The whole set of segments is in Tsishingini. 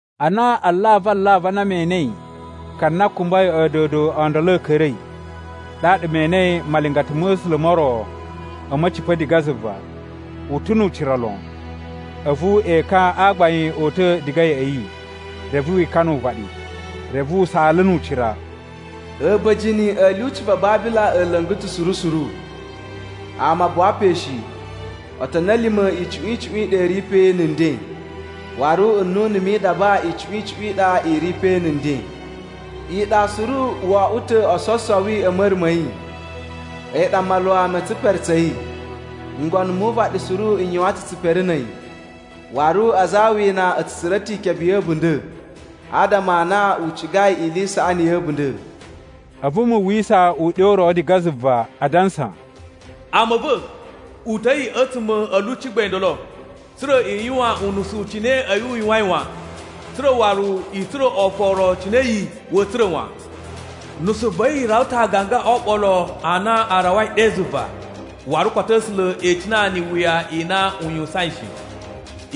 Ana alavu alavu a na me enei ka na kumbai a̱a̱dodo o ndolo a̱ ka̱ra̱i, ɗaɗa me enei malingata ma̱ A̱sula̱ mo ro a̱ ma̱cipa̱ diga zuva. U ta̱ nu ucira lon, a̱vu ekan a gbain o uta̱ diga ya̱ꞌa̱ yi, reve wi ikana uvaɗi. Reve u saala nu ucira: “A̱ba̱jini a̱ lyuci va Babila a̱ la̱nga̱ ta̱ suru suru. Ama a buwa pe shi, otoni a̱ lima̱ icuꞌun icuꞌun i ɗa i ri pe na̱ nden. Waru nnunu mi idaba icuꞌun icuꞌun i ɗa i ri pe na̱ nden. Iɗa suru o oꞌwo ta̱ ososowi a̱ ma̱ra̱ ma̱ yi, a̱yi ɗa maluwa ma̱ tsipere tsa̱ yi. Ngono mu uvaɗi suru n yuwan ta̱ tsipere na̱ a̱yi, waru aza a awina a̱ tsu tsura̱ ta̱ ikebe ya̱ a̱bunda̱ adama a na u cigai ili i saꞌani ya̱ a̱bunda̱.” A̱vu mu uwwisa uɗyo u ro diga zuva adansa: “Ama a̱ va̱, uta̱i a̱tsuma̱ a̱ lyuci gbain ndolo, tsa̱ra̱ i yuwan unusu cine a̱yi u yuwain wan, tsa̱ra̱ waru i tsura̱ oforo cine a̱yi wa̱a̱ tsura̱ wan. Nusu va̱ yi rawa ta̱ aaganga o oɓolo a na a rawai ɗe zuva, waru koto A̱sula̱ e icina ni iwuya i na u yuwusain shi.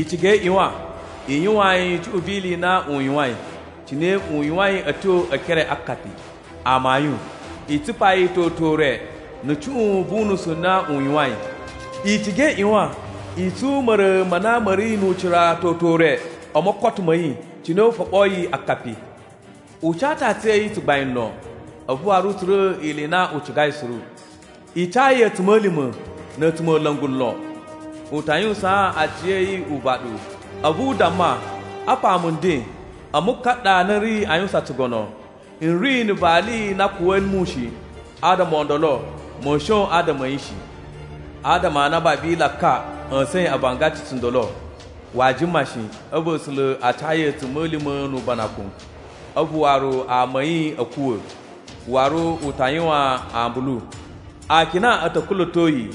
I ciga i ꞌyuwan i yuwaan yi cuꞌun vi ili i na u yuwain cine u yuwain a̱ tyo e ekere a akapi. Amayun, i tsupa yi toto ure na̱ cuꞌun vu unusu u na u yuwain. I ciga i ꞌyuwan i tsun ma̱ra̱ ma na ma̱ ri nu ucira toto ure o mokoto ma̱ yi, cine u foɓoyi akapi. U ca ta̱ aciya̱yi tsugbain lon, a̱vu waru u tsura̱ ili i na u cigai suru. I ca yi a̱tsuma̱lima̱ na̱ a̱tsumola̱ngu lon. U ta yuwusaan aciya̱yi uvaɗu, a̱vu u damma, ‘Apa mu nden, a̱mu ka ɗa na n ri a yuwusan tsugono. N ri na̱ vali na a̱a̱ kuwa̱ mu shi, adama o ndolo ma̱a̱ shon adama a̱ yi shi.’ Adama a na Babila ka ꞌya̱sa̱in avangaci tsundolo, waa jima shi, a̱vu A̱sula̱ a ca yi a̱tsuma̱lima̱ nu ubanakun, a̱vu waru ama a̱ yi a̱ kuwa̱, waru u ta yuwan ambulu. Akina a̱ ta̱ kula̱to yi,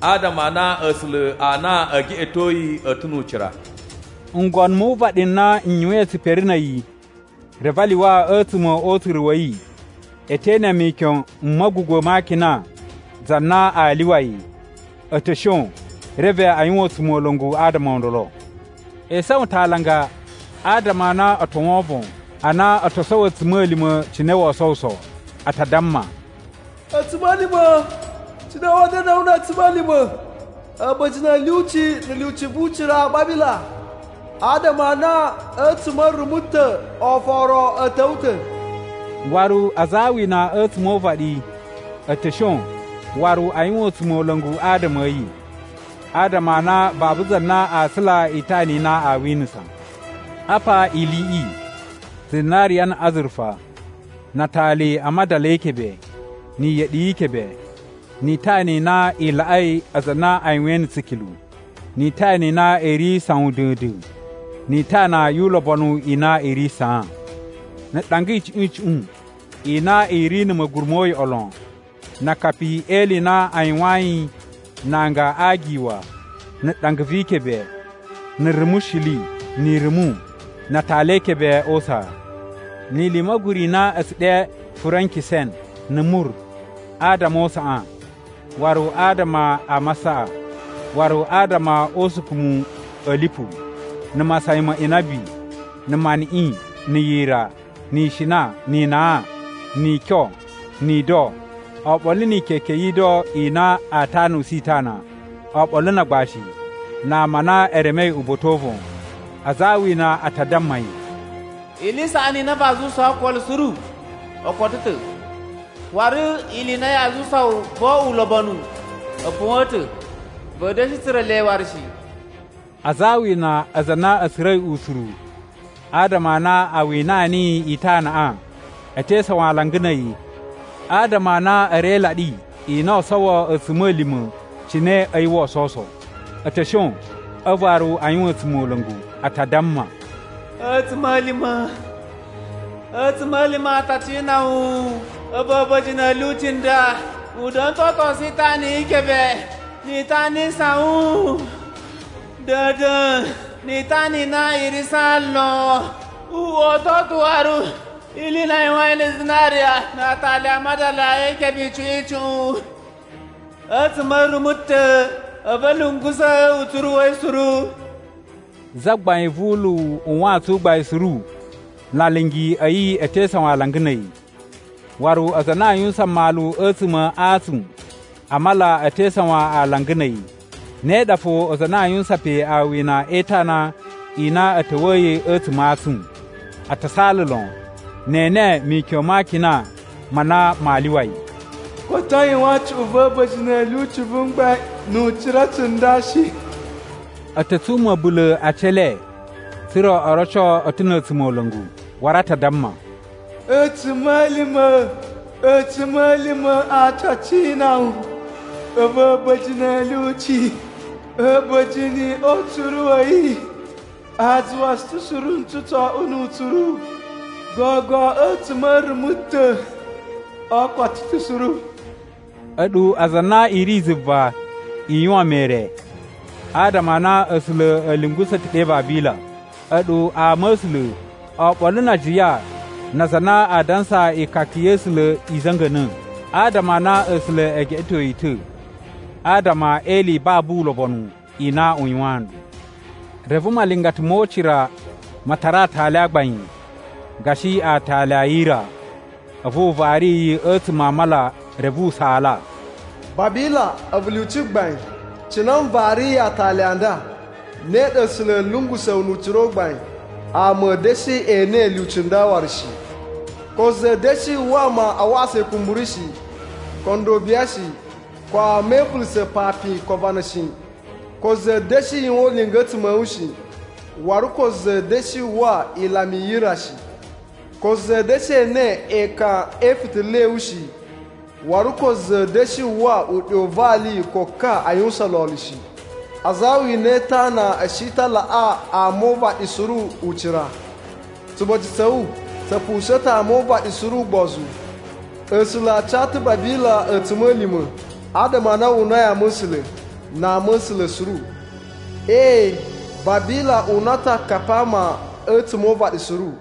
adama a na A̱sula̱ a na ee geꞌeto yi, a̱ ta̱ nu ucira.” Ngono mu uvaɗi n na n yuwain tsipere na̱ a̱yi reve a lyuwa a̱tsuma̱ o utsuru wa̱ yi, e te ene mikyon m ma̱gugwa̱ ma akina za na aa lyuwa yi, a̱ ta̱ shon reve a yuwan a̱tsumola̱ngu adama o ndolo. E isawan ta̱ alanga, adama a na o to wovon a na o to sowo a̱tsuma̱lima̱ cine woo sowuso. A ta damma, “A̱tsuma̱lima̱! Cine wa̱a̱ da̱na̱ wu na̱ a̱tsuma̱lima̱, a̱ba̱jini a̱ lyuci na̱ lyuci vu ucira Babila, adama a na a̱tsuma̱ a̱ rumu ta̱ oforo a̱ ta̱wa̱ wu ta̱!” Waru aza a awina a̱tsuma̱ o uvaɗi a̱ ta̱ shon waru a yuwan a̱tsumola̱ngu adama a̱ yi, adama a na babu za na aa tsula itana i na aa winasa. Apa iliꞌi: zinariya, na̱ azurufa, na atali a madala e ikebe, ni iyeɗi yi ikebe, ni itana i na i laꞌai aza a na a yuwain na̱ tsikilu, ni itana i na i ri sawun da̱a̱n-da̱a̱n, ni itana yu ulobonu i na i ri saan, na̱ ɗanga icuꞌun icuꞌun i na i ri na̱ ma̱guru mo uyoꞌo lon, na akapi e ili i na a yuwayin na anga a agiwa na̱ ɗanga vi ikebe, na̱ rumushili, ni irumu, na atali e ikebe o usaa, ni ili i ma̱guru i na a̱ tsu ɗe furenkisen na̱ mur adama o usaꞌan, waru adama a masaꞌa, waru adama o usukumu a̱ lipu, na̱ masayan ma inabi, na̱ maniꞌin, na̱ yira, ni ishina, ni inan, ni ikyon, ni ido, oɓolo ni ikeke yi ido i na a tanusu itana, oɓolo na agbashi, na ama a na e remei uba̱ta̱ o uvon. Aza a awina a ta damma yi, “Ili i saꞌani i na vaa zuwusaa okolo suru o koto ta̱, waru ili i na yaa zuwusa wu vo oꞌwo ulobonu a̱ puwa̱n ta̱, va̱a̱ da̱shi tsura̱ le waru shi!” Aza a awina, aza a na a̱ tsura̱i utsuru adama a na a winaa niyi itanaꞌa, e te isawan alanga na̱ a̱yi, adama a na a̱ ri e ilaɗi i na oo sowo a̱tsuma̱lima̱ cine a̱yi woo sowuso. A̱ ta̱ shon a̱vu waru a yuwan a̱tsumola̱ngu. A ta damma: “A̱tsuma̱lima̱! A̱tsuma̱lima̱ a ta cina wu a̱vu a̱ba̱jini a̱ lyuci a nda! U da̱na̱ ta̱ o otosu itana yi ikebe, ni itana i sawun da̱a̱n-da̱a̱n, ni itana i na i ri saan lon. U oto ta̱ waru ili i na a yuwain na̱ zinariya, na atali a madala e ikebe icuꞌun icuꞌun! A̱tsuma̱ a̱ rumu ta̱ a̱vu a̱ lungusa̱ utsuru wa̱ yi suru!” Zagbain vu uluwu u wantsun u gbain suru na alingi a̱ yi a̱ te isawan alanga na̱ a̱yi. Waru aza a na a yuwusan mmalu a̱tsuma̱ a antsun a mala a̱ te isawan alanga na̱ a̱yi, ne ɗa fo aza a na a yuwusan pe awina e itana i na a̱ ta̱wa̱yi a̱tsuma̱ a antsun. A ta saala lon ne e ene mikyon ma akina ma na maa lyuwa yi, “Koto a yuwan cuꞌun va̱ a̱ba̱jini a̱ lyuci vu mgbain nu ucira tsunda shi!” A̱ ta̱ tsun ma̱bula̱ a aci e le tsa̱ra̱ o roco a̱ ta̱ na̱ a̱tsumola̱ngu. Waru a ta damma: “A̱tsuma̱lima̱, A̱tsuma̱lima̱ a ta cina wu a̱vu a̱ba̱jini a̱ lyuci! A̱ba̱jini o utsuru a̱ yi a zuwa tsu ta̱ suru ntsu tso oꞌwo nu utsuru. Gogo a̱tsuma̱ a̱ rumu ta̱ o koto ta̱ suru.” A̱ɗu aza a na i ri zuva, i yuwan mere, adama a na A̱sula̱ a̱ lungusa̱ ta̱ ɗe Babila. A̱ɗu ama a̱ A̱sula̱, oɓolo na ajiya na aza a na a dansa ikaka ya̱ A̱sula̱ i za̱nga̱na̱. Adama a na A̱sula̱ e geꞌeto yi ta̱ adama e ili i babu ulobonu i na u yuwaan nɗu. Reve malingata mo ucira ma tara aatali a gbain, gashi aatali a yira, a̱vu u vari yi a̱tsuma̱ a mala reve u saala: “Babila, a̱vu lyuci gbain, cine n variyi aatali a nda, ne ɗa A̱sula̱ a̱a̱ lungusa̱ wu nu ucira u gbain! Ama a̱a̱ da̱shi ene lyuci nda waru shi. Ko za a̱a̱ da̱shi uwwa ama a waꞌasa ikumburu shi, ko ndobiya shi, ko ama e ivulusa̱ papin ko avana shi. Ko za a̱a̱ da̱shi yuwan ulinga a̱tsuma̱ a̱ wu shi. Waru ko za a̱a̱ da̱shi uwwa ilama i yira shi. Ko za a̱a̱ da̱shi ene ekan e ifitila a̱ wu shi. Waru ko za a̱a̱ da̱shi uwwa uɗyo u vali ko ka a yuwusan lolo shi. Aza a awina e itana a̱ shi ta̱ a laꞌa ama o uvaɗi suru ucira. Tsuboci tsa̱ wu tsa̱ pusa̱a̱n ta̱ ama o uvaɗi suru ugbozu. A̱sula̱ a ca ta̱ Babila a̱tsuma̱lima̱ adama a na wu unai ama̱sula̱, na ama a̱ A̱sula̱ suru. Ee, Babila una ta̱ akapi a ama a̱tsuma̱ o uvaɗi suru.”